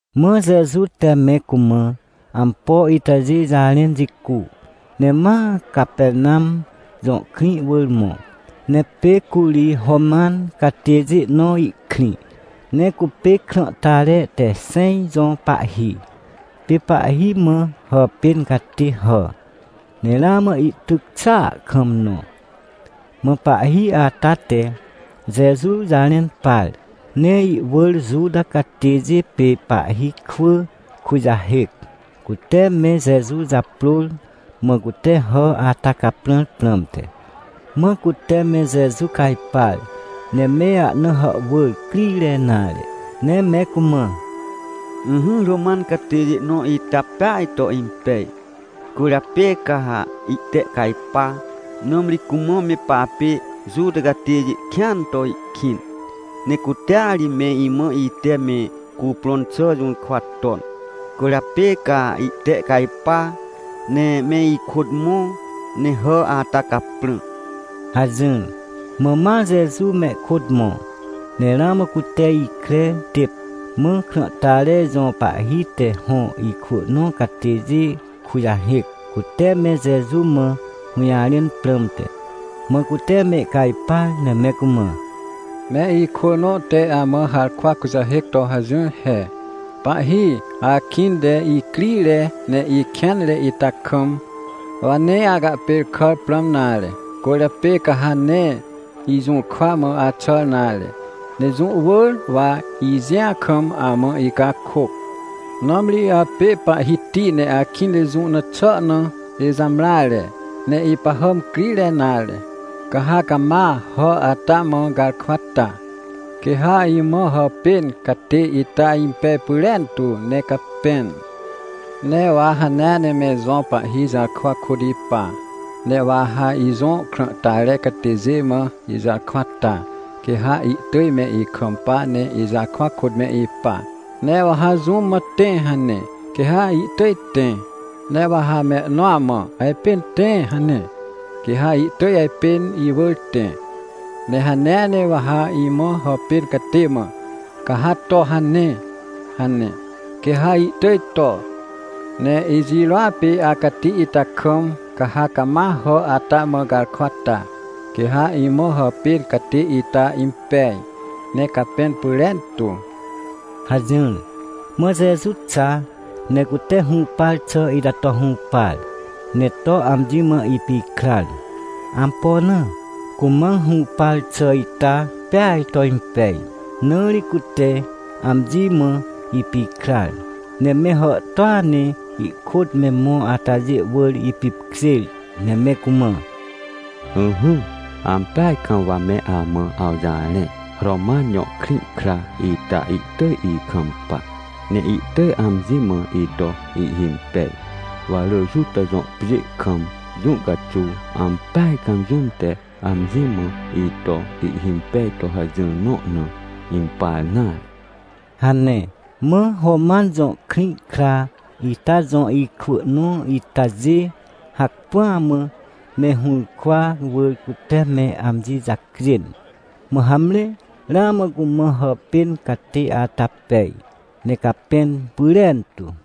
Mã Jeju te me cumã ampo itajê jarẽn jicu, ne ma Capernam jõ krĩ wỳr mõ. Ne pê curi Roman catêjê nõ ihkrĩ, ne cupê krãhtare te xẽj jõ pahhi. Pê pahhi mã hàpên catê hà, ne ramã ihtyc xàa kam nõ. Mã pahhi ata te Jeju jarẽn par, ne ihwỳr Juta catêjê pê pahhi kwỳ kujahêc, cute me Jeju japrôr, mã cute hà ata caprãr prãmte. Mã cute me Jeju cajpar, ne me ahna hàhwỳr crire nare, ne me cumã: ― Ỹhỹ, Roman catêjê nõ ita peaj to impej, cwỳrjapê ca ha ihtehcajpa. Nãmri cumã me papê Juta catêjê kĩan to ihkĩn, ne cutea ri me imã ite me cuprõn xà jũrkwa ton. Cwỳrjapê ca ihtehcajpa, ne me ikôt mõ, ne hà ata caprã ― hajỹr. Mã ma Jeju mehkôt mõ. Ne ramã cute ikre têp, mã krãhtare jõ pahhi te hõ ikwỳ nõ catêjê kujahêc, cute me Jeju mã hũjarẽn prãmte. Mã cute mehcajpar ne me cumã: ― Me ikwỳ nõ te amã harkwa kujahêc to hajỹr he: “Pahhi, akĩnte icrire ne ikêanre ita kam, wa nee acahpêrkàr prãm nare. Cwỳrjapê ca ha nee ijũrkwa mã axàr nare. Ne jũ wỳr wa ijĩa kam amã icakôc, nãmri apê Pahhiti ne akĩnte jũ na xà na ijamreare, ne ipahàm crire nare. Ca ha cama hà ata mã garkwa ta, quê ha imã hàpên catê ita impej pyrentu, ne capẽn. Ne wa hanea ne me ijõ pahhi jarkwa kôt ipa, ne wa ha ijõ krãhtare catêjê mã ijarkwa ta, quê ha ihtỳj me ikampa ne ijarkwa kôt me ipa. Ne wa ha jũm mã, ‘Tẽ!’ hane, quê ha ihtỳj tẽ. Ne wa ha mehnõa mã, ‘Ajpên tẽ!’ hane, quê ha ihtỳj ajpên iwỳr tẽ. Ne hanea ne wa ha imã hàpên catê mã, ‘Ca ha to hane!’ hane, quê ha ihtỳj to. Ne ijirôa pê acati ita kam, ca ha cama hà ata mã garkwa ta, quê ha imã hàpên catê ita impej, ne capẽn pyrentu” ― hajỹr. Mã Jeju xa, ne cute hũpar xà ita to hũpar, ne to amji mã ipikrar. Ampo na? Cumã hũpar xà ita peaj to impej. Na ri cute amji mã ipikrar, ne me hàhtôa ne ihkôt me mõ atajê wỳr ipipkjêr, ne me cumã: ― Ỹhỹ, ampeaj kam wa me amã awjarẽ, Roman jõ krĩ kra ita ihtỳj ikampa, ne ihtỳj amji mã ito ihhimpej. Wa rỳ Juta jõ pjê kam jũ caxuw, ampeaj kam jũm te amji mã ito ihhimpej to hajỹr nõ na, impar nare ― hane. Mã Roman jõ krĩ kra ita jõ ikwỳ nõ itajê, hacpỹa mã me hũrkwa wỳr cute me amji jacjên, mã hamre ramã cumã hàpên catê ata pej, ne capẽn pyrentu.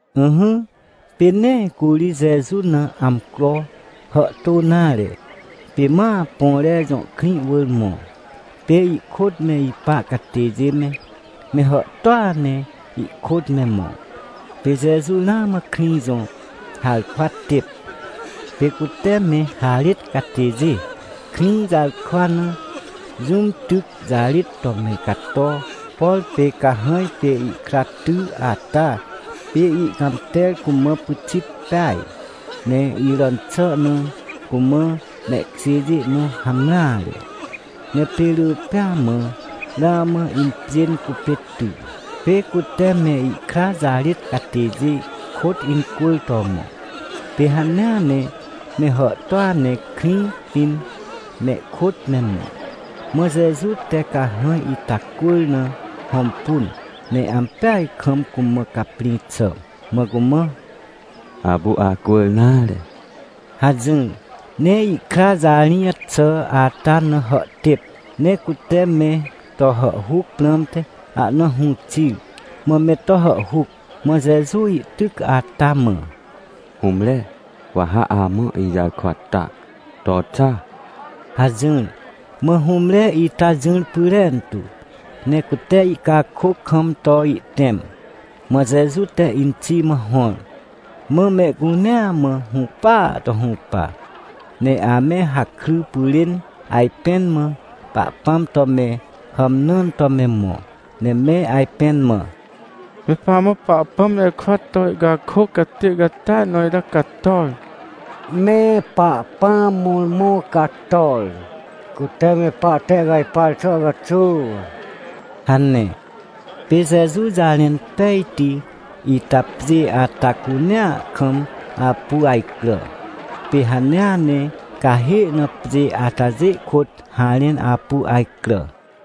Ỹhỹ, pê nee curi Jeju na amcro hàhtô nare, pê ma Põre jõ krĩ wỳr mõ. Pê ihkôt me ipa catêjê me, me hàhtôa ne ihkôt me mõ. Pê Jeju ramã krĩ jõ harkwa têp, pê cute me harêt catêjê krĩ jarkwa na, jũm tyc jarêt to me cato. Por pê cahãj pê ihkra ty ata pê ihcãmter cumã pyxit peaj. Ne iràn xà na cumã mehkjêjê nõ hamreare. Ne pê rỳ pêa mã ramã impjên cupê ty. Pê cute me ihkra jarêt catêjê kôt incwỳr to mõ. Pê hanea ne me hàhtôa ne krĩ pĩn, mehkôt me mõ. Mã Jeju te cahãj ita cwỳr na hõmpun, ne ampeaj kam cumã caprĩ xà, mã cumã: ― Apu acwỳr nare ― hajỹr. Ne ihkra jarĩj xà ata na hàhtêp, ne cute me to hàhhuc prãmte ahna hũ xir, mã me to hàhhuc, mã Jeju ihtyc ata mã: ― Hũmre, wa ha amã ijarkwa ta. To xa! ― hajỹr. Mã hũmre ita jỹr pyrentu, ne cute ihcakôc kam to ihtẽm. Mã Jeju te inxi mã hõr. Mã mehcunea mã hũpaa to hũpa. Ne ame hakry pyrên ajpẽn mã Pahpãm to me hàmnãn to me mõ, ne me ajpẽn mã: ― Me pamã Pahpãm jarkwa to ihcakôc catê catia nõ ita cator! Me Pahpãm mõrmõ cator, cute me pahtehcajpar xà caxuw ― hane. Pê Jeju jarẽn pejti ita pjê ata cunea kam apu ajcrà. Pê hanea ne cahê na pjê atajê kôt harẽn apu ajcrà.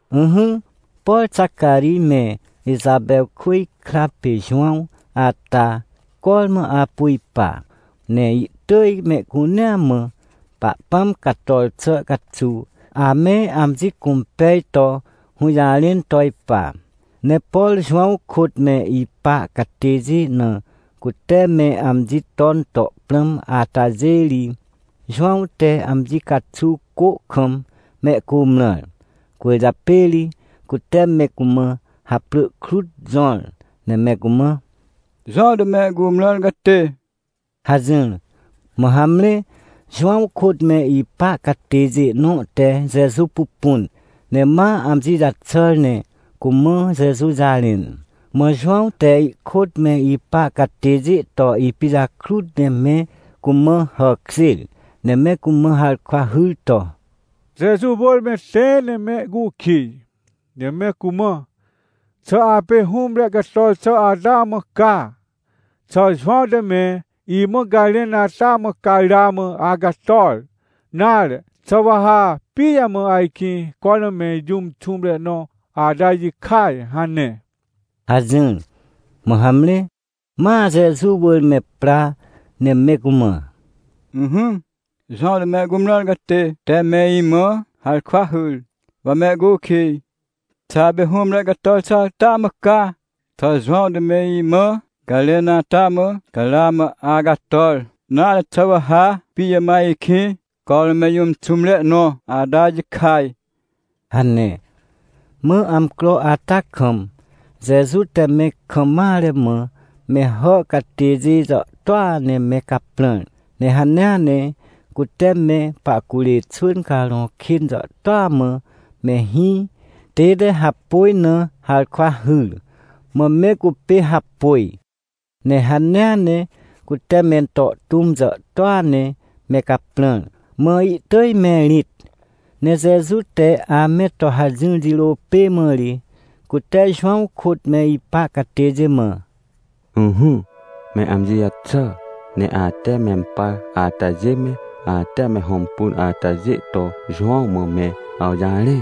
Ỹhỹ, por Xacarij me Ixapewkwỳj kra pê Jowãw ata, cormã apu ipa, ne ihtỳj mehcunea mã Pahpãm cator xà caxuw ame amji cũmpej to hũjarẽn to ipa. Ne por Jowãw kôt me ipa catêjê na cute me amji ton to prãm atajê ri, Jowãw te amji caxuw cô kam mehcumrãr. Cwỳrjapê ri cute me cumã haprỳ krut jõr, ne me cumã: “Jowãw te me cumrãr catê” hajỹr. Mã hamre, Jowãw kôt me ipa catêjê nõ te Jeju pupun, ne ma amji jaxàr ne cumã Jeju jarẽn. Mã Jowãw te ihkôt me ipa catêjê to ipijakrut ne me cumã hàkjêr, ne me cumã harkwa hyr to: ― Jeju wỳr me tẽ ne mehcukij, ne me cumã: “Xà apê hũmre cator xà ata mã ca? Xà Jowãw te me imã garẽn ata mã ca ramã acator? Nare xà wa ha pijamã ajkĩ cormã me jũm xũmre nõ ata jikaj?” hane ― hajỹr. Mã hamre, ma Jeju wỳr me pra, ne me cumã: ― Ỹhỹ, Jowãw te me cumrãr catê te me imã harkwa hyr, wa me acukij: “Xà apê hũmre cator xà ata mã ca? Xà Jowãw te me imã garẽn ata mã ca ramã acator? Nare xà wa ha pijamã ajkĩ cormã me jũm xũmre nõ ata jikaj?” ― hane. Mã amcro ata kam Jeju te me kam mare mã me hà catêjê jàhtôa ne me caprãr. Ne hanea ne cute me pahcurê xwỳn carõ kên jàhtôa mã me hĩ tête hapôj na harkwa hyr, mã me cupê hapôj. Ne hanea ne cute mento tũm jàhtôa ne me caprãr, mã ihtỳj me irĩt. Ne Jeju te ame to hajỹr jirô pê mã ri, cute Jowãw kôt me ipa catêjê mã: ― Ỹhỹ, me amji jaxà, ne ate mempar atajê me, ate me hõmpun atajê to Jowãw mã me awjarẽ.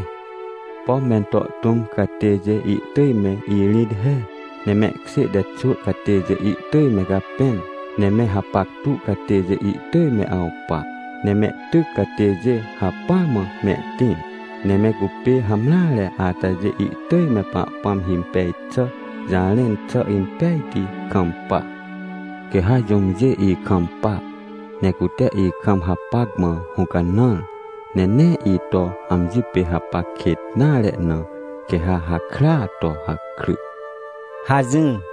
Pom mento tũm catêjê ihtỳj me irĩt he, ne mehkjê te xwỳ catêjê ihtỳj me capẽn, ne me hapactu catêjê ihtỳj me awpa, ne mehtyc catêjê hacpỹa mã mehtĩr, ne me cupê hamreare atajê ihtỳj me Pahpãm himpej xà jarẽn xà impejti kampa. Quê ha jũmjê ikampa, ne cute ikam hapac mã hũcanãr, ne nee ito amji pê hapac kêt nare na, quê ha hakrya to hakry ― hajỹr.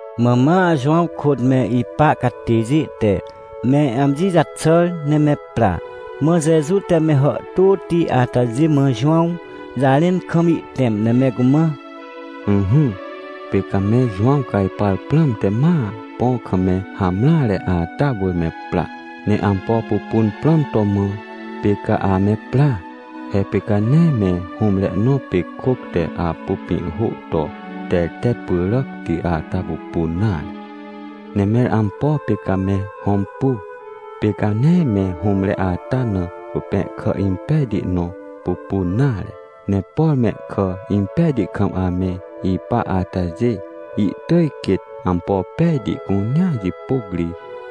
Mã ma Jowãw kôt me ipa catêjê te me amji jaxàr ne me pra. Mã Jeju te me hàhtôti atajê mã Jowãw jarẽn kam ihtẽm, ne me cumã: ― Ỹhỹ, pê ca me Jowãw cajpar prãmte ma põ kam me hamreare ata wỳr me pra. Ne ampo pupun prãm to mã, pê ca ame pra? He pê ca nee me hũmre nõ pê kôc te apu pĩhhô to tertet pyràcti ata pupun nare. Ne mẽr ampo pê ca me hõmpu? Pê ca nee me hũmre ata na cupẽhkà impejti nõ pupun nare. Ne por mehkà impejti kam ame ipa atajê, ihtỳj quêt ampo pejti cunea jipôc ri,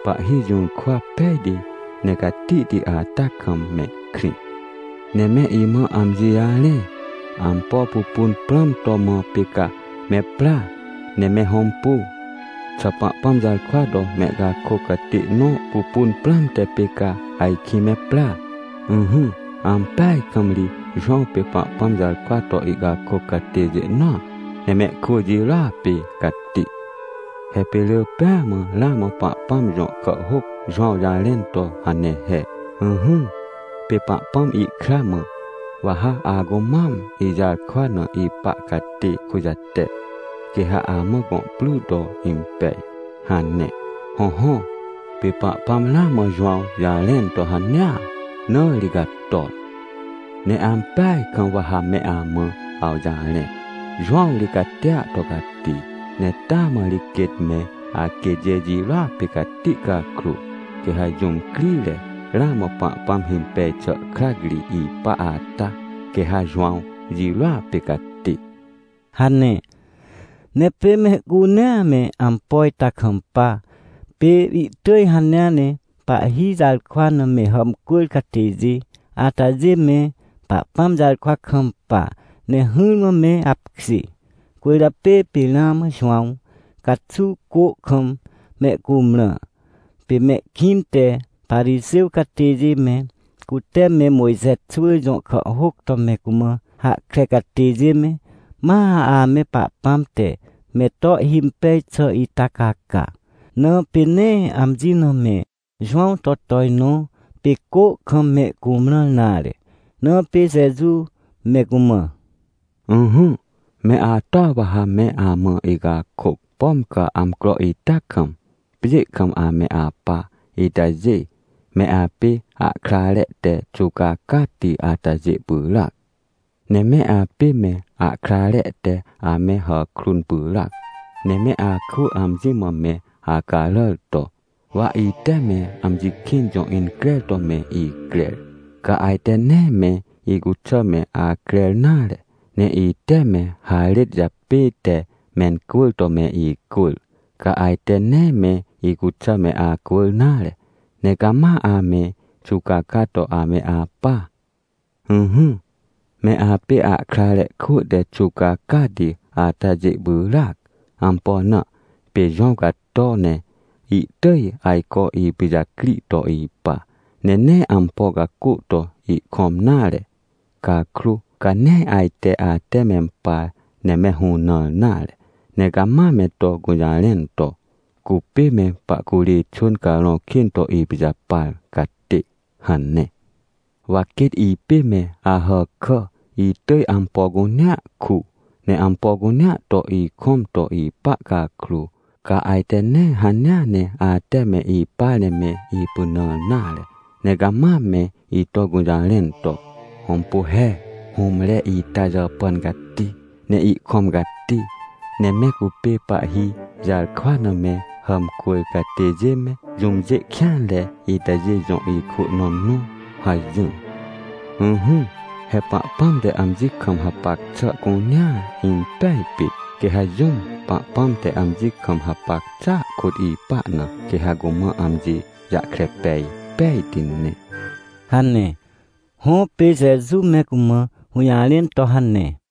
pahhi jũrkwa pejti ne catihti ata kam mehkrĩ. Ne me imã amji jarẽ, ampo pupun prãm to mã pê ca me pra ne me hõmpu? Xà Pahpãm jarkwa to mehcakôc catê nõ pupun prãmte pê ca ajkĩ me pra? Ỹhỹ, ampeaj kam ri Jowãw pê Pahpãm jarkwa to ihcakôc catêjê nõa, ne mehkwỳ jirôa pê cati. He pê rỳ pêa mã ramã Pahpãm jõ kàhhôc Jowãw jarẽn to hane he: “Ỹhỹ, pê Pahpãm ihkra mã: ‘Wa ha acumam ijarkwa na ipa catê kujate, quê ha amã gõ pry to impej’” hane. Hõhõ, pê Pahpãm ramã Jowãw jarẽn to hanea, na ri cator. ― Ne ampeaj kam wa ha me amã awjarẽ. Jowãw ri catia to cati, ne taa mã ri quêt me aquêtjê jirôa pê cati cakrô, quê ha jũm crire ramã Pahpãm himpej xà krac ri ipa ata, quê ha Jowãw jirôa pê cati ― hane. Ne pê mehcunea me ampo ita kampa. Pê ihtỳj hanea ne pahhi jarkwa na me hàmcwỳr catêjê atajê me Pahpãm jarkwa kampa ne hỹrmã me apkjê. Cwỳrjapê pê ramã Jowãw caxuw, cô kam mehcumrã. Pê mehkĩnte Parixêw catêjê me, cute me Mojxe xwỳ jõ kàhhôc to me cumã hahkre catêjê me, ma ame Pahpãm te me to ihhimpej xà ita caca, na pê nee amji na me Jowãw to tojnõ, pê cô kam me cumrãr nare. Na pê Jeju me cumã: ― Ỹhỹ, me atoa wa ha me amã icakôc. Pom ca amcro ita kam, pjê kam ame apa itajê, me apê ahkrare te xuwcacati atajê pyràac. Ne me apê me ahkrare te ame hàkrun pyràac. Ne me akwỳ amji mã me acaràr to: “Wa ite me amji kĩn jõ increr to me icrer, ca ajte nee me icuxà me acrer nare. Ne ite me harêt japête mencwỳr to me icwỳr, ca ajte nee me icuxà me acwỳr nare, ne cama ame xuwcaca to ame apa”. Ỹhỹ, me apê ahkrare kwỳ te xuwcacati atajê pyràac. Ampo na? Pê Jowãw cato ne ihtỳj ajco ipijacri to ipa, ne nee ampo cacô to ihkõm nare. Cakrô, ca nee ajte ate mempar ne me hũnãr nare, ne cama me to gũjarẽn to: “Cupê me pahcurê xwỳn carõ kên to ipijapar catê” hane. Wa quêt ipê me Ahàkà, itỳj ampo cunea ku, ne ampo cunea to ikõm to ipa cakrô, ca ajte nee hanea ne ate me ipar ne me ipynãr nare, ne cama me ito gũjarẽn to: “Hõmpu he, hũmre ita jàpàn cati, ne ihkõm cati, ne me cupê pahhi jarkwa na me hàmcwỳr catêjê me, jũmjê kêanre itajê jõ ikwỳ nõ nõ” hajỹr. Ỹhỹ, he Pahpãm te amji kam hapac xà cunea impej pit, quê ha jũm Pahpãm te amji kam hapac xàa kôt ipa na, quê ha cumã amji jahkre pej pejti ne ― hane. Hõ, pê Jeju me cumã hũjarẽn to hane.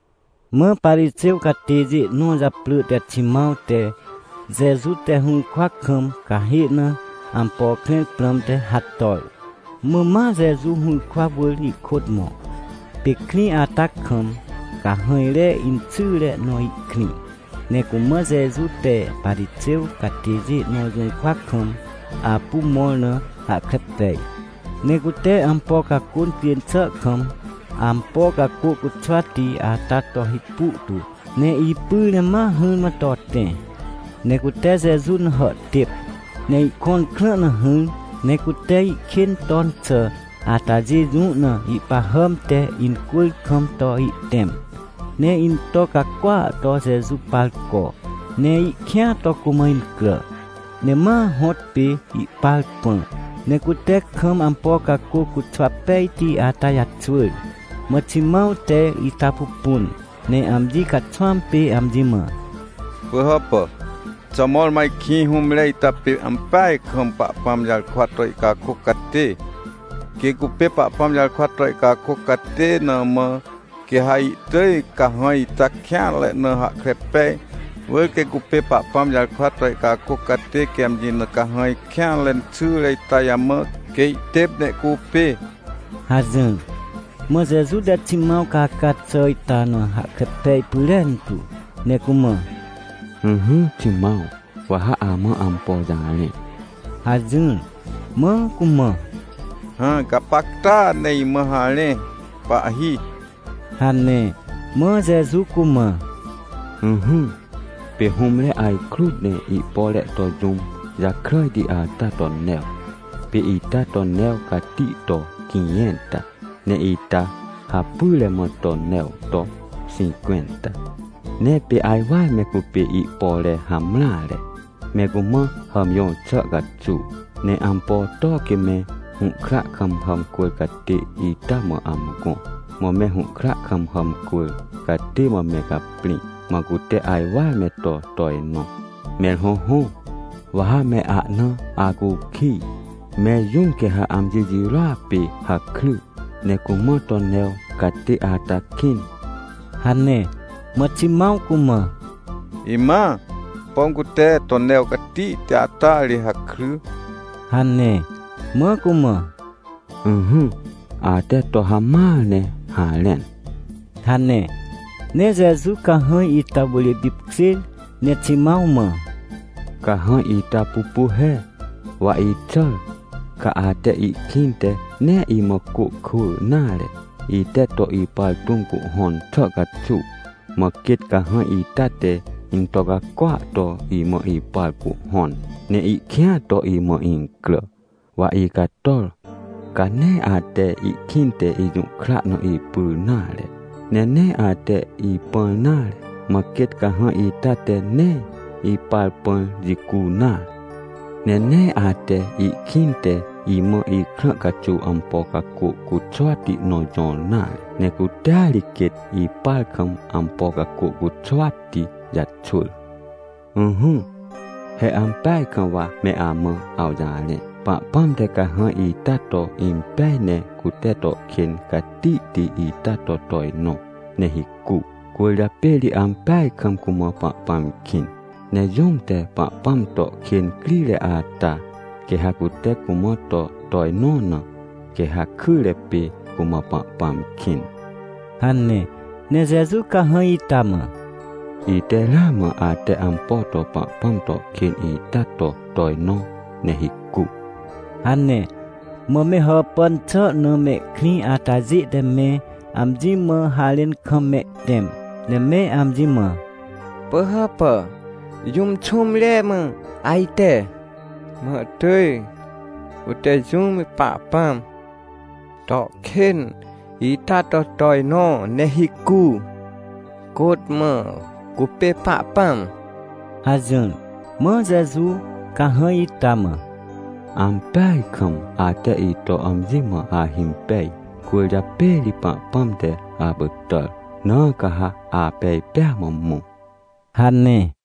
Mã Parixêw catêjê nõ japrỳ te Ximãw te, Jeju te hũrkwa kam cahê na ampo krẽr prãmte, hator. Mã ma Jeju hũrkwa wỳr ihkôt mõ. Pê krĩ ata kam cahãjre inxyre nõ ihkrĩ, ne cumã Jeju te Parixêw catêjê nõ jũrkwa kam apu mõr na hahkre pej. Ne cute ampo cacô incjên xà kam, ampo cacô cuxwati ata to hipu tu, ne ipyr ne ma hỹrmã to tẽ. Ne cute Jeju na hàhtêp, ne ihkõn krã na hỹr, ne cute ihkên ton xà atajê jũ na ihpahàm te incwỳr kam to ihtẽm, ne into cacôa to Jeju par co, ne ihkĩa to cumã incrà. Ne ma hõtpê ihpar pã, ne cute kam ampo cacô cuxwa pejti ata jaxwỳr. Mã Ximãw te ita pupun, ne amji caxwãm pê amji mã: ― Pỳhàpà, xà mõrmõ ajkĩ hũmre ita pê ampeaj kam Pahpãm jarkwa to ihcakôc catê? Quê cupê Pahpãm jarkwa to ihcakôc catê na mã, quê ha ihtỳj cahãj ita kêanre na hahkre pej. Wỳr quê cupê Pahpãm jarkwa to ihcakôc catê quê amji na cahãj kêanre inxyre ita jamã, quê ihtêp ne ihcupê ― hajỹr. Mã Jeju te Ximãw caca xà ita na hahkre pej pyrentu, ne cumã: ― Ỹhỹ, Ximãw, wa ha amã ampo jarẽ ― hajỹr. Mã cumã: ― Hã, gapacta ne imã harẽ, pahhi ― hane. Mã Jeju cumã: ― Ỹhỹ, pê hũmre ajkrut ne ihpore to jũm jakràjti ata to new. Pê ita to new cati to quĩjẽnta, ne ita hapyre mã to new to xĩncwẽnta. Ne pê ajwar me cupê ihpore hamreare, me cumã hàmjõr xà caxuw. Ne ampo to quê me hũhkra kam hàmcwỳr catê ita mã amgõ? Mã me hũhkra kam hàmcwỳr catê mã me caprĩ, mã cute ajwar me to tojnõ. Mẽr hõhõ, wa ha me ahna acukij, mẽr jũm quê ha amji jirôa pê hakry, ne cumã to new catê ata kĩn? ― hane. Mã Ximãw cumã: ― Imãa, pom cute to new catihti ata ri hakry ― hane. Mã cumã: ― Ỹhỹ, ate to hamãar ne harẽn ― hane. Ne Jeju cahãj ita wỳr ipipkjêr ne Ximãw mã: ― Cahãj ita pupu he. Wa ixàr, ca ate ihkĩnte nee imã cô kwỳ nare, ite to ipar tũm cuhhõn xà caxuw, mã quêt cahãj ita te into cacôa to imã ipar cuhhõn, ne ihkĩa to imã incrà. Wa icator, ca nee ate ihkĩnte ijũhkra na ipyr nare, ne nee ate ipãr nare. Mã quêt cahãj ita te nee ipar pãr jicu nare. Ne nee ate ihkĩnte imã ikrã caxuw ampo cacô cuxwati nõ jõr nare. Ne cutea ri quêt ipar kam ampo cacô cuxwati jaxwỳr. Ỹhỹ, he ampeaj kam wa me amã awjarẽ, Pahpãm te cahãj ita to impej ne cute to kên catihti ita to tojnõ, ne hicu, cwỳrjapê ri ampeaj kam cumã Pahpãm kĩn. Ne jũm te Pahpãm to kên crire ata, quê ha cute cumã to tojnõ na, quê ha kyre pê cumã Pahpãm kĩn ― hane. Ne Jeju cahãj ita mã: ― Ite ramã ate ampo to Pahpãm to kên ita to tojnõ ne hicu ― hane. Mã me hàpàn xà na mehkrĩ atajê te me amji mã harẽn kam mehtẽm, ne me amji mã: ― Pỳhàpà, jũm xũmre mã ajte, mã ihtỳj cute jũm te Pahpãm to kên ita to tojnõ ne hicu? Côt mã cupê Pahpãm? ― hajỹr. Mã Jeju cahãj ita mã: ― Ampeaj kam ate ito amji mã ahimpej, cwỳrjapê ri Pahpãm te apytàr. Na ca ha apej pêa mã mõ ― hane.